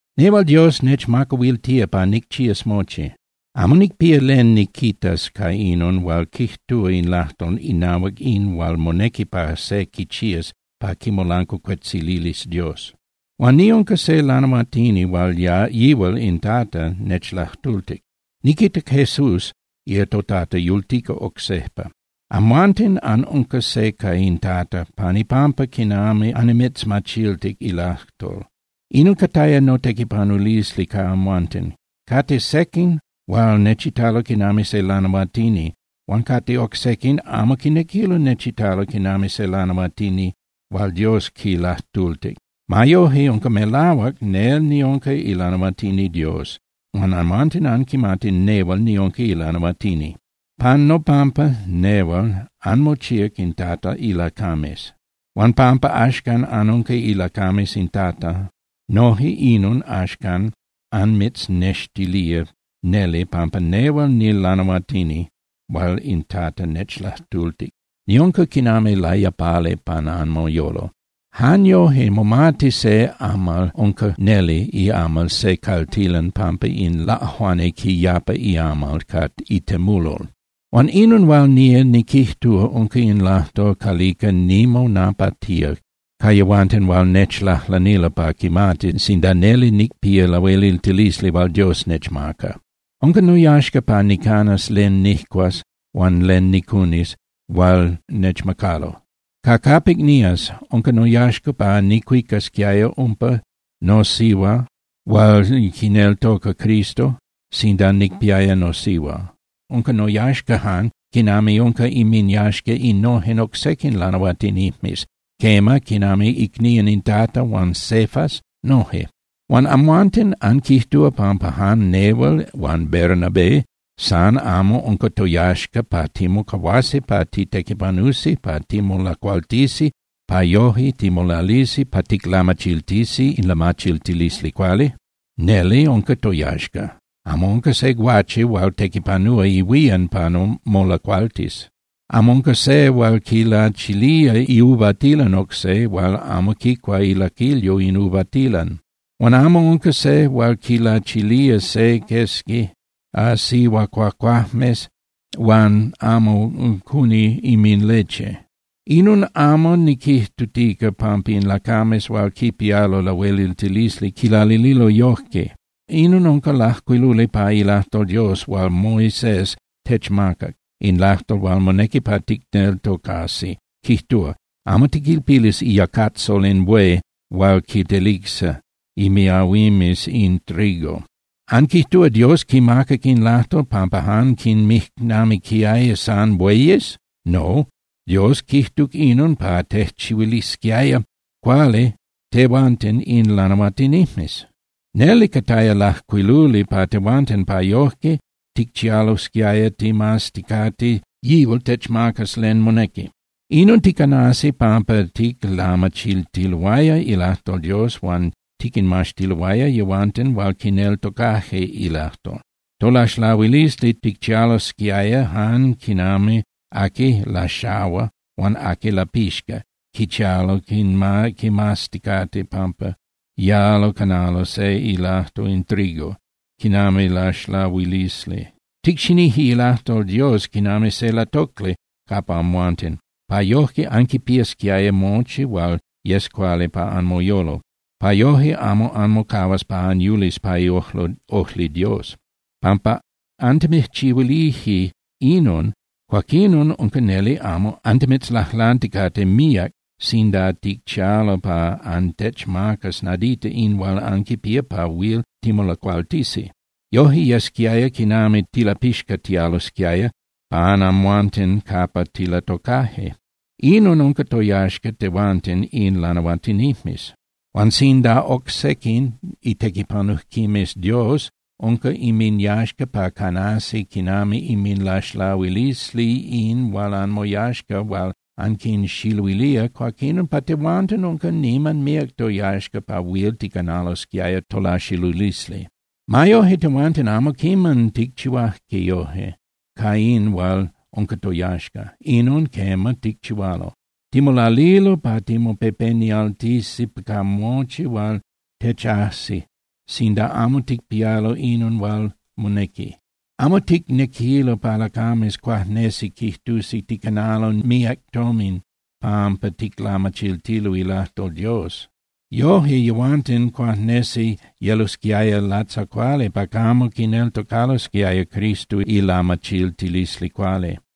Nehual Dios nechmacahuiltía pa nicchías mochi. Amo nicpía len niquitas ca inon hual quijtúa in lajtol inahuac in hual monequi pa se quichías pa quimolancuacuetzilis Dios. Huan niunca se lanahuatini hual yihual in Tata nechlajtultic, niquitac Jesús toTata yultica oc sejpa. Amhuanten anunca se ca in Tata pan ipampa quinami annimitzmachiltic ilajtol. Inon cataya notequipanulisli ca amhuanten. Cate sequin hual nechitalo quinami se lanahuatini, huan cate oc sequin amo quinequilo nechitalo quinami se lanahuatini hual Dios quilajtultic. Ma yojque unca melahuac nel niunca ilanahuatini Dios, huan amhuanten anquimati nehual niunca ilanahuatini. Pan nopampa nehual anmochíac in Tata ilacames. Huan pampa axcan anunca ilacames in Tata, noje inon axcan anmitznextilía neli pampa nehual nilanahuatini hual in Tata nechlajtultic. Niunca quinami layapali pan anmoyolo. Jan yoje momati se amal unca neli iamal se caltilan pampa in laꞌajuani quiyapa iamal ca itemulol. Huan inon hual nía niquijtúa unca in lajtol calica nimonapatía ca yehuanten hual nechlajlanilo pa quimatis sinda neli nicpía lahueliltilisli hual Dios nechmaca. Unca noyaxca pa nicanas len nijcuas huan len nicunis hual nechmacalo. Ca capic nías, unca noyaxca pa nicuicasquiaya umpa nosihua hual quineltoca Cristo sinda nicpiaya nosihua. Unca noyaxca jan quinami unca inminyaxca innojen oc sequin lanahuatinijmes, quema, quinami icnían in Tata huan Cefas noje. Huan amhuanten ¿anquijtúa pampa jan nehual huan Bernabé san amo unca toyaxca pa timocahuasi pa titequipanusi pa timolacualtisi pa yoje timolalisi pa ticlamachiltisi in lamachiltilisli cuali? Neli unca toyaxca. Amo unca se guache hual tequipanúa ihuían pa molacualtis. Amo unca se hual quilachilía iuvatilan oc se huan amo quicua ilaquilyo in uvatilan. Huan amo unca se hual quilachilía se quesqui sihuacuacuajmes huan amo cuni inminleche. Inon amo niquijtutica pampa in lacames hual quipialo lahueliltilisli quilalililo yojque. Inon unca lajcuiluli pa ilajtol Dios hual Moisés techmacac, in lajtol hual monequi pa ticneltocasi, quijtúa: “Amo tiquilpilis iyacatzol in buey hual quitelicsa inmiahuimes in trigo.” ¿Anquijtúa Dios quimacac in lajtol pampa jan quinmijnamiquiaya san bueyes? No, Dios quijtuc inon pa tejchihuilisquiaya cuali tehuanten in lanahuatinijmes. Neli cataya lajcuiluli pa tehuanten pa yojque ticchialosquiaya ticmazticate yihual techmacas len monequi. Inon ticanasi pampa ticlamachiltiloaya ilajtol Dios huan tiquinmaxtiloaya yehuanten hual quineltocaje ilajtol. Tolaxlahuilisli ticchialosquiaya jan quinami aqui laxahua huan aqui lapixca, quichialo quimazticate pampa yalo canalo se ilajco in trigo quinami laxlahuilisli. Ticxinije ilajtol Dios quinami se latocli capa amhuanten, pa yojque anquipiasquiaya mochi hual yes cuali pa anmoyolo, pa yoje amo anmocahuas pa anyulis pa iojli Dios. Pampa antimijchihuilije inon, cuaquinon unca neli amo antimitzlajlanticate míac sinda ticchialo pa antechmacas nadita in hual anquipía pa huil timolacualtisi. Yoje yesquiaya quinami tilapixcatialosquiaya capa amhuanten capa tilatocaje. Inon unca toyaxca tehuanten in lanahuatinijmes. Huan sinda ca oc sequin itequipanujquimes Dios unca inminyaxca pa canasi quinami inminlaxlahuilisli in hual anmoyaxca hual anquinxiluilía, cuaquín pa tehuanten unca niman míac toyaxca pa huil ticanalosquiaya tolaxilulisli. Ma yoje tehuanten amo quiman ticchihuaje yojque ca in hual unca toyaxca. Inon, quema, ticchihualo. Timolalilo pa timopepenialtisi ca mochi hual techajsi sinda amo ticpialo inon hual monequi. Amo ticnequilo pa lacames cuajnesi quijtusi ticanalo míac tomin pampa ticlamachiltilo ilajtol Dios. Yoje yehuanten cuajnesi yelosquiaya latzacuali pa camo quineltocalosquiaya Cristo ilamachiltilisli cuali.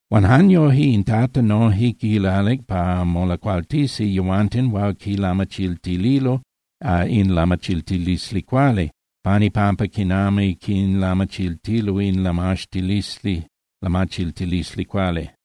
Huan jan yojque in Tata noje quilalic pa molacualtisi yehuanten hual quilamachiltililo in lamachiltilisli cuali pan ipampa quinami quinlamachiltilo in lamachiltilisli cuali.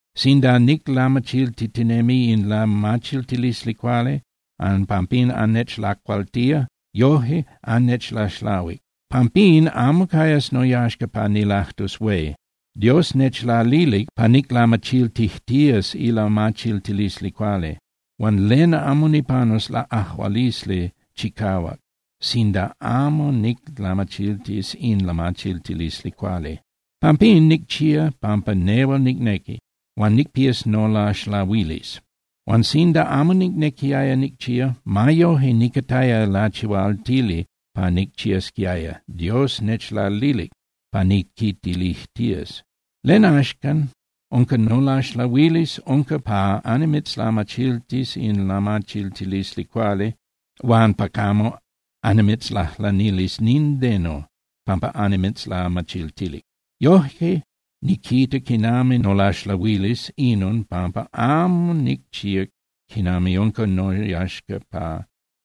Sinda niclamachiltitinemi in lamachiltilisli cuali, huan pampín annechlacualtía, yoje annechlaxlahuic. Pampín amo cayas noyaxca pa nilajtus hué. Dios nechlalilic pa niclamachiltijtías ilamachiltilisli cuali. Huan ¡len amo nipanus laꞌajualisli chicahuac sinda amo niclamachiltis in lamachiltilisli cuali! Pampín, nicchía pampa nehual nicnequi, huan nicpías nolaxlahuilisli. Huan sinda amo nicnequiaya nicchía, ma yoje nicataya lachihualtili pa nicchiasquiaya, Dios nechlalilic pa niquitilijtías. ¿Len, axan, unca nolaxlahuilisli? Nolaxlahuilisli unca pa annimitzlamachiltis in lamachiltilisli cuali huan pa camo annimitzlajlanilis nindeno pampa annimitzlamachiltilic. Yoje niquita quinami nolaxlahuilisli inon pampa amo nicchíac quinami unca noyaxca pa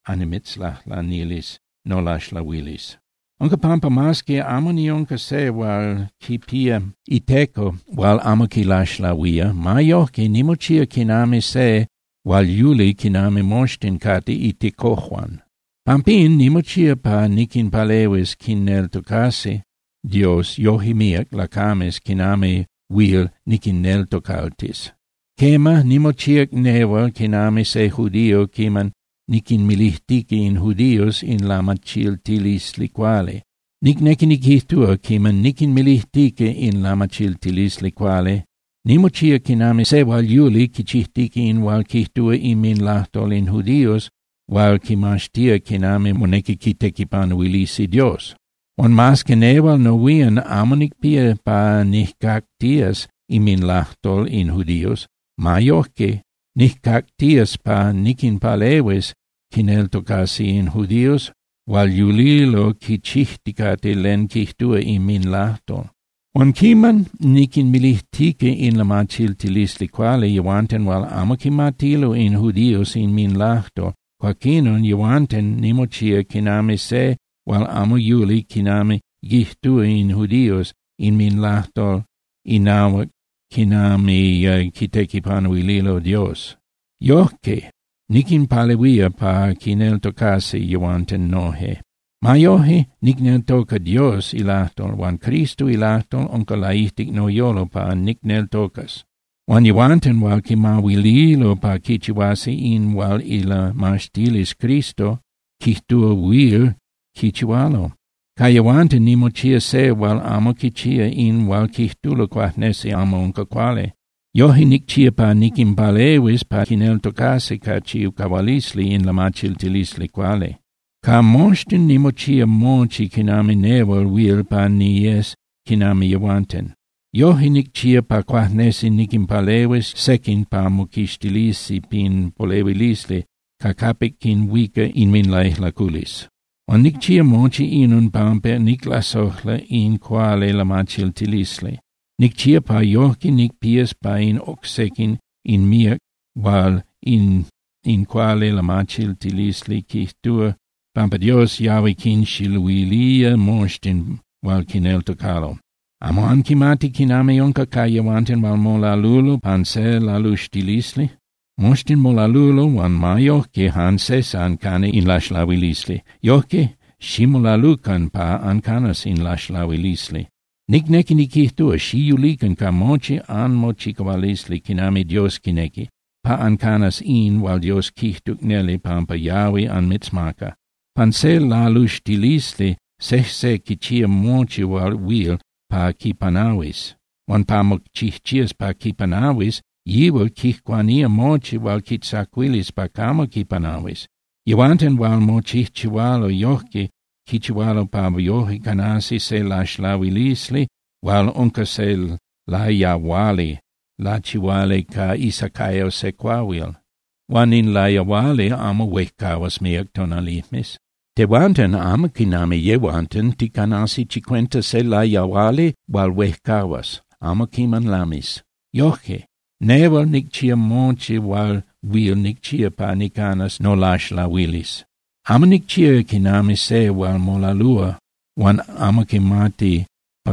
annimitzlajlanilis nolaxlahuilisli. Unca pampa mas que amo niunca se hual quipía iteco hual amo quilaxlahuía, ma yojque nimochía quinami se hual yuli quinami moxtin cate itecojuan. Pampín nimochía pa niquinpalehuis quineltocasi Dios yoje míac lacames quinami huil niquinneltocaltis. Quema, nimochíac nehual quinami se judío quiman niquinmilijtica in judíos in lamachiltilisli cuali. Nicnequi niquijtúa, quiman niquinmilijtica in lamachiltilisli cuali, nimochía quinami se hual yuli quichijtica in hual quijtúa inminlajtol in judíos hual quimaxtía quinami monequi quitequipanuilisi Dios. Huan mas que nehual nohuían amo nicpía pa nijcactías inminlajtol in judíos, ma yojque nijcactías pa niquinpalehuis quineltocasi in judíos hual yulilo quichijticate len quijtúa inminlajtol. Huan quiman niquinmilijtica in lamachiltilisli cuali yehuanten hual amo quimatilo in judíos inminlajtol, cuaquinon nehual nimochía quinami se hual amo yuli quinami quijtúa in judíos inminlajtol inahuac quinami quitequipanuililo Dios. Yojque niquinpalehuía pa quineltocasi yehuanten noje. Ma yoje, nicneltoca Dios ilajtol, huan Cristo ilajtol unca laijtic noyolo pa nicneltocas. Cate yehuanten hual quimahuililo pa quichihuasi in hual ilamaxtilisli Cristo quijtúa huil quichihualo. Ca yehuanten nimochía se hual amo quichía in hual quijtulo cuajnesi amo unca cuali. Yoje nicchía pa niquinpalehuis pa quineltocasi ca chicahualisli in lamachiltilisli cuali. Ca moxtin nimochía mochi quinami nehual huil pa niyes quinami yehuanten. Yoje nicchía pa cuajnesi niquinpalehuis sequin pa moquixtilisi pin polehuilisli ca capic quinhuica inminlaijlaculisli. Huan nicchía mochi inon pampa niclasojla in cuali lamachiltilisli. Nicchía pa yojque nicpías ca in oc sequin in míac hual in cuali lamachiltilisli quijtúa pampa Dios yahui quinxiluilía moxtin hual quineltocalo. ¿Amo anquimati quinami unca ca yehuanten hual molalulo pan se laluxtilisli? Moxtin molalulo huan ma yojque jan se san cana in laxlahuilisli. Yojque, ximolalucan pa ancanas in laxlahuilisli. Nicnequi niquijtúa, xiyulican ca mochi anmochicahualisli quinami Dios quinequi, pa ancanas in hual Dios quijtuc neli pampa yahui anmitzmaca. Pan se laluxtilisli, sejse quichía mochi hual huil pa quipanahuis. Huan pa mochijchías pa quipanahuis, yihual quijcuanía mochi hual quitzacuilis pa camo quipanahuis. Yehuanten hual mochijchihualo yojque quichihualo pa yoje canasi se laxlahuilisli hual unca se layahuali lachihuali ca isacayo se cuahuil. Huan in layahuali amo huejcahuas míac tonalijmes. Tehuanten, amo quinami yehuanten, ticanasi chicuenta se layahuali hual huejcahuas, amo quiman lamis. Yoje, nehual nicchía mochi hual huil nicchía pa nicanas nolaxlahuilisli. Amo nicchía quinami se hual molalúa huan amo quimati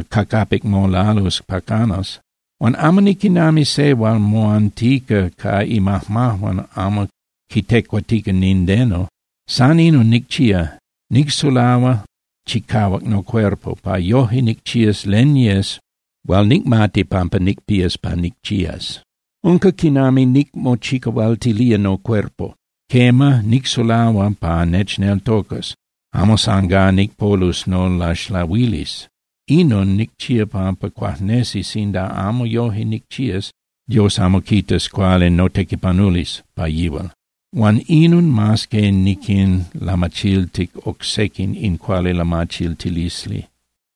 ca capic molalus pa canas. Huan amo niquinami se hual moantica ca imajmajuan amo quitecuatica nindeno. San inon nicchía: Nicsulahua chicahuac nocuerpo pa yoje nicchías len yes hual nicmati pampa nicpías pa nicchías. Unca quinami nicmochicahualtilía nocuerpo. Quema, nicsulahua pa nechneltocas, amo san gá nicpolus nolaxlahuilisli. Inon nicchía pampa cuajnesi sinda amo yoje nicchías, Dios amo quitas cuali notequipanulisli pa yihual. Huan inon mas que niquinlamachiltic oc sequin in cuali lamachiltilisli.